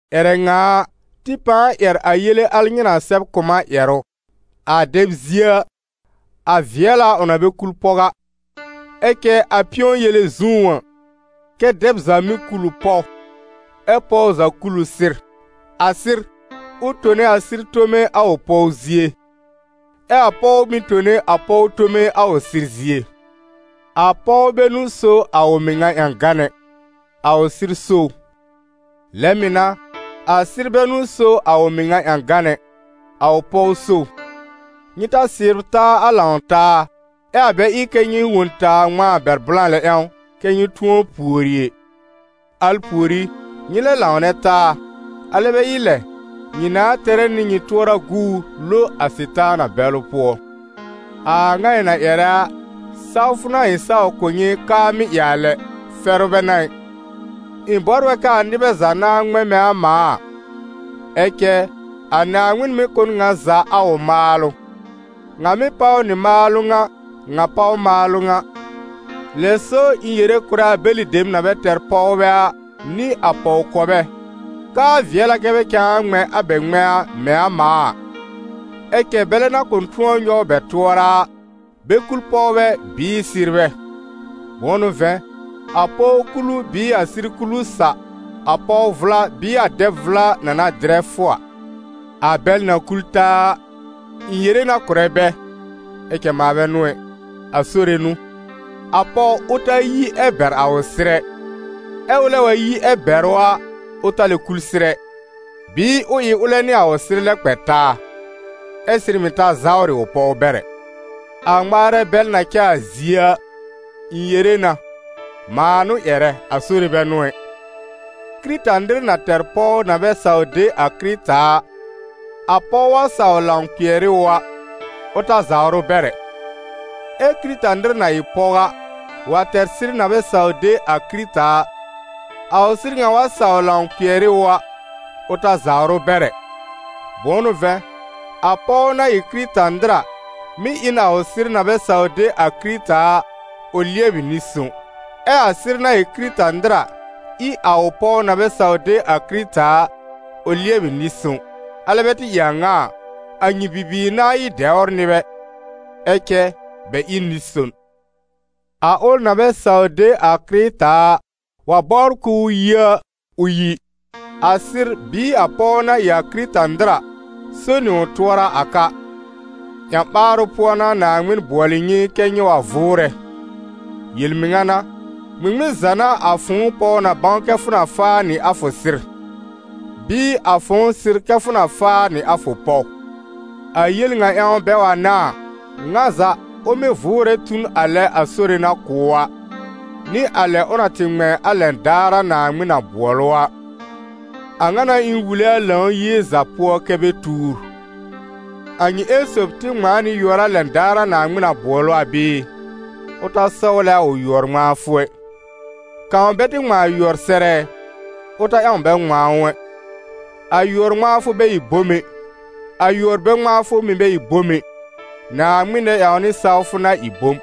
Ƴɛrɛ ŋa a, tɩ pãa ƴɛr a yele al nyɩ na sɛb kʋ̀ m a ƴɛrʋ. A dɛb zie a, a vɩɛl a ʋ na bɛ kul pɔw a. Ɛ cɛ a pɩ̃ɔ-yele zũú a, kɛ́ dɛb za mɩ́ kul ʋ pɔw, ɛ́ pɔw za kul ʋ sɩr. A sɩr, ʋ tone a sɩr tome a ʋ pɔw zie, ɛ a pɔw mɩ̀ tone a pɔw tome a ʋ sɩr zie. A pɔw bɛ n'ʋ so a ʋ mɩŋa ƴãgan ɛ, a ʋ sɩr so ʋ. Lɛ mɩ̀ n'a, a sɩr bɛ n'ʋ so a ʋ mɩŋa ƴãgan ɛ, a ʋ pɔw so ʋ. Nyɩ ta sɩbr taa a lãw-taa, ɛ a bɛ ɩ kɛ́ nyɩ wõ n taa ŋmãa bɛr blã lɛ ƴãw kɛ́ nyɩ tʋ̃ɔ pùori ɛ; al pùorí, nyɩ lɛ lãwnɛ taa, alɛ bɛ ɩ lɛ, nyɩ nãa tɛrɛ nɩ nyɩ tʋɔra guur lo a Sɩtaana bɛlʋ pʋɔ. A a ŋa ɩ̃ na ƴɛrɛ a, sawfʋ n'a ɩ̃ saw kʋ̀ nyɩ k'aa mɩ́ ɩ a lɛ, fɛrʋ bɛ n'a ɩ. Ɩ̃ bɔbr a k'aa nɩbɛ za nãa ŋmɛ̃ mɛ̃ a mãa a; ɛ cɛ a Naaŋmɩn mɩ́ kʋ̀ n ŋa za a ʋ maalʋ: ŋa mɩ́ páw nɩ maalʋ ŋa, ŋa páw maalʋ ŋa. Lɛ so ɩ̃ yere kʋ̀rɛ a bɛlɩ dem na bɛ tɛr pɔwbɛ a, nɩ a pɔw-kɔbɛ, k'aa vɩɛl a kɛ́ bɛ cãa ŋmɛ̃ a bɛ ŋmɛ̃a mɛ̃ a mãa a. Ɛ cɛ bɛlɛ na kʋ̃ tʋ̃ɔ nyɔw bɛ tʋɔra a, bɛ kul pɔwbɛ bɩɩ sɩrbɛ. Bʋ̃ʋ n'ʋ vɛ̃, a pɔw kulu bɩɩ a sɩr kulu sa, a pɔw vʋla bɩɩ a dɛb vʋla na na dɩrɛ fʋ a. A bɛl na kul taa a, ɩ̃ yere na kʋ̀rɛ bɛ, (ɛ cɛ mãa bɛ n'ʋ ɛ): a Sore n'ʋ: a pɔw ʋ ta yi ɛ bɛr a ʋ sɩr ɛ, ɛ ʋlɛ wa yi ɛ bɛr ʋ a, ʋ ta lɛ kul sɩr ɛ, bɩɩ ʋ ɩ ʋlɛ nɩ a ʋ sɩr lɛ kpɛ taa, ɛ sɩr mɩ̀ ta zawrɩ ʋ pɔw bɛr ɛ. A ŋmaarɛ bɛl na cɛ a zie a, ɩ̃ yere na, (mãa n'ʋ ƴɛrɛ, a Sore bɛ n'ʋ ɛ): Kɩrɩta-nɩr na tɛr pɔw na bɛ saw de a Kɩrɩta a, a pɔw wa saw lãw kpɩɛr ɩ ʋ a, ʋ ta zawr ʋ bɛr ɛ. Ɛ Kɩrɩta-nɩr na ɩ pɔw a, wa tɛr sɩr na bɛ saw de a Kɩrɩta a, a ʋ sɩr ŋa wa saw lãw kpɩɛr ɩ ʋ a, ʋ ta zawr ʋ bɛr ɛ. Bʋ̃ʋ n'ʋ vɛ̃, a pɔw na ɩ Kɩrɩta-nɩr a, mɩ́ ɩ n a ʋ sɩr na bɛ saw de a Kɩrɩta a, ʋ lɩɛbɩ nɩ-sõw; ɛ a sɩr na ɩ Kɩrɩta-nɩr a, ɩ a ʋ pɔw na bɛ saw de a Kɩrɩta a, ʋ lɩɛbɩ nɩ-sõw. Alɛ bɛ tɩ ɩ a ŋa a, a nyɩ bibiir nãa ɩ n dɛwr nɩbɛ, ɛ cɛ bɛ ɩ n nɩ-son. A ʋl na bɛ saw de a Kɩrɩta a, wa bɔbr k'ʋʋ yi a, ʋ yi. A sɩr bɩɩ a pɔw na ɩ a Kɩrɩta-nɩr a, so nɩ ʋ tʋɔra a ka. Ƴã-ɓaarʋ pʋɔ n'a Naaŋmɩn bʋɔlɩ nyɩ kɛ́ nyɩ wa vʋʋrɛ. Yel-mɩŋa n'a, ŋmɩŋmɩn za n'a a fʋ̃ʋ pɔw na bãw kɛ fʋ na faa nɩ a fʋ sɩr? Bɩɩ a fʋ̃ʋ sɩr kɛ fʋ na faa nɩ a fʋ pɔw? A yel ŋa ƴãw bɛ wa n'a a, ŋa za, ʋ mɩ́ vʋʋrɛ tu n a lɛ a Sore na kʋ̀ ʋ a, nɩ a lɛ ʋ na tɩ ŋmɛ̃ a lɛn daar a Naaŋmɩn na bʋɔl ʋ a. A ŋa n'a ɩ̃ wule a Lãw-yie za pʋɔ kɛ́ bɛ tuur. A nyɩ ƴẽn sob tɩ ŋmãa nɩ yʋɔr a lɛn daar a Naaŋmɩn na bʋɔl ʋ a bɩɩ? Ʋ ta sɔwlɛ a ʋ yʋɔr-ŋmãafʋ ɛ. Kãw bɛ tɩ ŋmãa yʋɔr sɛr ɛ? Ʋ ta ƴãw bɛ ŋmãa ʋ ɛ. A yʋɔr-ŋmãafʋ bɛ ɩ bom ɛ, a yʋɔr-bɛ-ŋmãafʋ mɩ̀ bɛ ɩ bom ɛ. Naaŋmɩn nɛ-ƴãwnɩ sawfʋ n'a ɩ bom.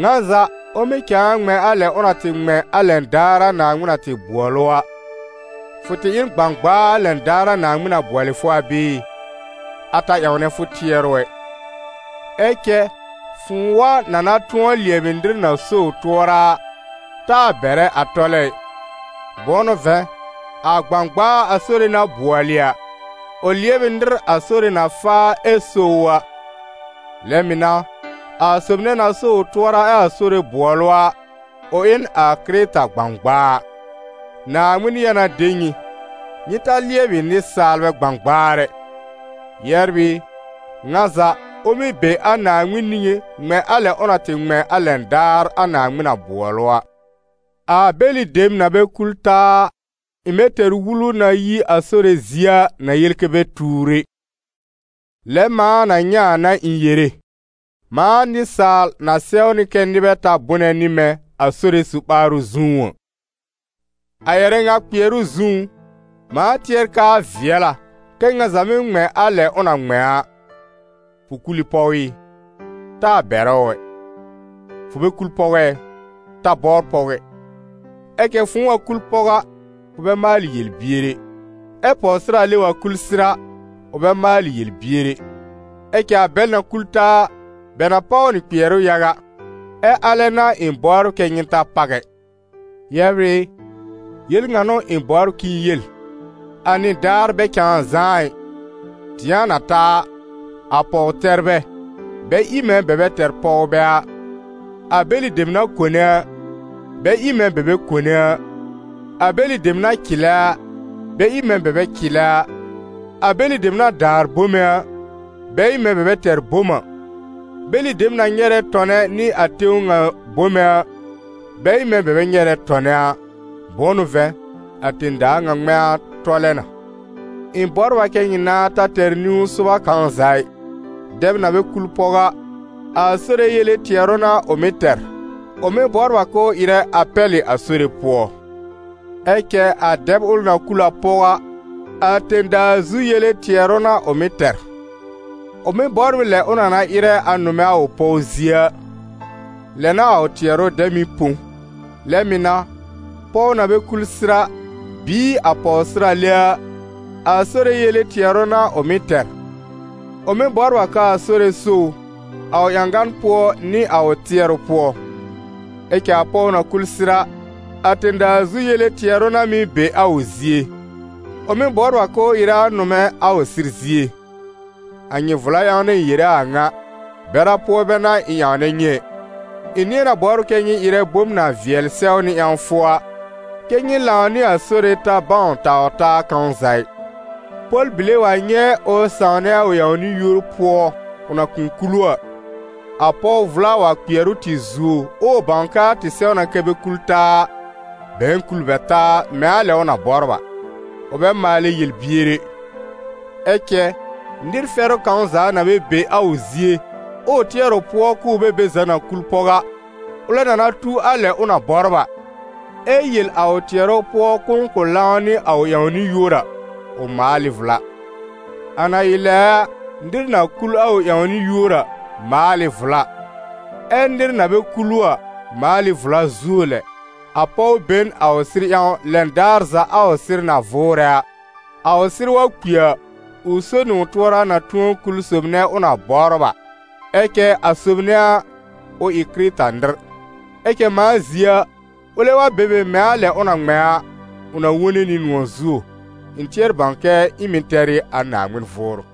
Ŋa za, ʋ mɩ́ cãa ŋmɛ̃ a lɛ ʋ na tɩ ŋmɛ̃ a lɛn daar a Naaŋmɩn na tɩ bʋɔl ʋ a. Fʋ tɩ ɩ n gbãgbaa a lɛn daar a Naaŋmɩn na bʋɔlɩ fʋ a bɩɩ? A ta ƴãwnɛ fʋ tɩɛrʋ ɛ. Ɛ cɛ fʋ̃ʋ wa na na tʋ̃ɔ lɩɛbɩ nɩr na so ʋ tʋɔra a, taa bɛrɛ a tɔlɛ ɩ. Bʋ̃ʋ n'ʋ vɛ̃, a gbãgbaa a Sore na bʋɔlɩ a, ʋ lɩɛb ɩ nɩr a Sore na faa ɛ so ʋ a. Lɛ mɩ̀ n'a, a sob nɛ na so ʋ tʋɔra ɛ a Sore bʋɔl ʋ a, ʋ ɩ n a Kɩrɩta gbãgbaa. Naaŋmɩn ya na de nyɩ: nyɩ ta lɩɛbɩ nɩsaalbɛ gbãgbaar ɛ. Yɛbr ɩ, ŋa za, ʋ mɩ́ be a Naaŋmɩn niŋé ŋmɛ̃ a lɛ ʋ na tɩ ŋmɛ̃ a lɛn daar a Naaŋmɩn na bʋɔl ʋ a. A bɛlɩ dem na bɛ kul taa a, ɩ̃ bɛ tɛr wulu na yi a Sore zie a, na yel kɛ́ bɛ tuur ɛ. Lɛ mãa na nyɛ̃ a n'a ɩ̃ yere, mãa nɩsaal na sɛwnɩ kɛ́ nɩbɛ ta bʋnɛ nɩ mɛ̃ a Sore su-ɓaarʋ zũú a. A ƴɛrɛ ŋa kpɩɛrʋ zũú, mãa tɩɛr k'aa vɩɛl a, kɛ ŋa za mɩ́ ŋmɛ̃ a lɛ ʋ na ŋmɛ̃ a. Fʋ kul ɩ pɔw ɩ? Taa bɛrɛ ʋ ɛ. Fʋ bɛ kul pɔw ɛ? Ta bɔbr pɔw ɛ. Ɛ cɛ fʋ̃ʋ wa kul pɔw a, fʋ bɛ maalɩ yel-bier ɛ. Ɛ pɔwsɩrale wa kul sɩr a, ʋ bɛ maalɩ yel-bier ɛ. Ɛ cɛ a bɛl na kul taa a, bɛ na páw nɩ kpɩɛrʋ yaga, ɛ alɛ n'a ɩ̃ bɔbr kɛ́ nyɩ ta páw ɛ. Yɛbr ɩ, yel ŋa n'ʋ ɩ̃ bɔbr k'ɩ̃ɩ yel: a nɩdaar bɛ cãa zãá ɩ. Dɩ̃a na ta a, a pɔw-tɛrbɛ, bɛ ɩ mɛ̃ bɛ bɛ tɛr pɔwbɛ a, a bɛlɩ dem na kone a, bɛ ɩ mɛ̃ bɛ bɛ kone a, a bɛlɩ dem na cɩlɛ a, bɛ ɩ mɛ̃ bɛ bɛ cɩlɛ a, a bɛlɩ dem na daar bome a, bɛ ɩ mɛ̃ bɛ bɛ tɛr bom a, bɛlɩ dem na nyɛrɛ tɔnɛ nɩ a tẽw ŋa bome a, bɛ ɩ mɛ̃ bɛ bɛ nyɛrɛ tɔnɛ a. Bʋ̃ʋ n'ʋ vɛ̃, a tẽ-daa ŋa ŋmɛ̃a tɔlɛ na. Ɩ̃ bɔbr a kɛ nyɩ nãa ta tɛr niw-sʋba kãw za ɩ. Dɛb na bɛ kul pɔw a, a Sore yele tɩɛrʋ n'a ʋ mɩ́ tɛr, ʋ mɩ́ bɔbr a k'ʋʋ ɩrɛ a pɛlɩ a Sore pʋɔ. Ɛ cɛ a dɛb ʋl na kul a pɔw a, a tẽ-daa zu yele tɩɛrʋ n'a ʋ mɩ́ tɛr: ʋ mɩ́ bɔbr ɩ lɛ ʋ na na ɩrɛ a nʋmɛ a ʋ pɔw zie a, lɛ n'a a ʋ tɩɛrʋ dɛ mɩ́ põ. Lɛ mɩ̀ n'a, pɔw na bɛ kul sɩr a, bɩɩ a pɔwsɩrale a, a Sore yele tɩɛrʋ n'a ʋ mɩ́ tɛr. Ʋ mɩ́ bɔbr a k'aa Sore so ʋ, a ʋ ƴãgan pʋɔ nɩ a ʋ tɩɛrʋ pʋɔ. Ɛ cɛ a pɔw na kul sɩr a, a tẽ-daa zu yele tɩɛrʋ n'a mɩ́ be a ʋ zie: ʋ mɩ́ bɔbr a k'ʋʋ ɩrɛ a nʋmɛ a ʋ sɩr zie. A nyɩ vla ƴãw n'a ɩ̃ yere a a ŋa, bɛra pʋɔ bɛ n'a ɩ̃ ƴãwnɛ nyɩ ɛ, ɩ̃ nɩ̃ɛ na bɔbr kɛ́ nyɩ ɩrɛ bom na vɩɛl sɛwnɩ ƴãwfʋ a, kɛ́ nyɩ lãw nɩ a Sore ta bãw taw-taa kãw za ɩ. Pɔl-bile wa nyɛ̃ ʋ sãwnɛ a ʋ ƴãwnɩ-yúor pʋɔ, ʋ na kʋ̃ kul ʋ a, a pɔw vʋla wa kpɩɛr ʋ tɩ zuo, ɛ ʋ bãw k'aa tɩ sɛw na kɛ bɛ kul taa a, bɛ̃ɛ kul bɛ taa mɛ̃ a lɛ ʋ na bɔbr a. Ʋ bɛ maalɛ yel-bier ɛ. Ɛ cɛ, nɩr fɛrʋ kãw za na bɛ be ʋ zie, ɛ ʋ tɩɛr ʋ pʋɔ k'ʋʋ bɛ be za na kul pɔw a, ʋlɛ na na tu a lɛ ʋ na bɔbr a, ɛ yel a ʋ tɩɛrʋ pʋɔ k'ʋʋ kʋ̃ lãw nɩ a ʋ ƴãwnɩ-yúor a, ʋ maal ɩ vla. A na ɩ lɛ a, nɩr na kul a ʋ ƴãwnɩ-yúor a, maal ɩ vla, ɛ nɩr na bɛ kul ʋ a, maal ɩ vla zuo lɛ. A pɔw be n a ʋ sɩr ƴãw lɛn daar za a ʋ sɩr na vʋʋrɛ a. A ʋ sɩr wa kpi a, ʋ so nɩ ʋ tʋɔra na tʋ̃ɔ kul sob nɛ ʋ na bɔbr a, ɛ cɛ a sob nɛ a, ʋ ɩ Kɩrɩta-nɩr. Ɛ cɛ mãa zie a, ʋlɛ wa be be mɛ̃ a lɛ ʋ na ŋmɛ̃ a, ʋ na wone nɩ nʋ̃ɔ̀ zuo. Ɩ̃ tɩɛr bãw k'ɩ̃ɩ mɩ̀ tɛr ɩ a Naaŋmɩn Vʋʋrʋ.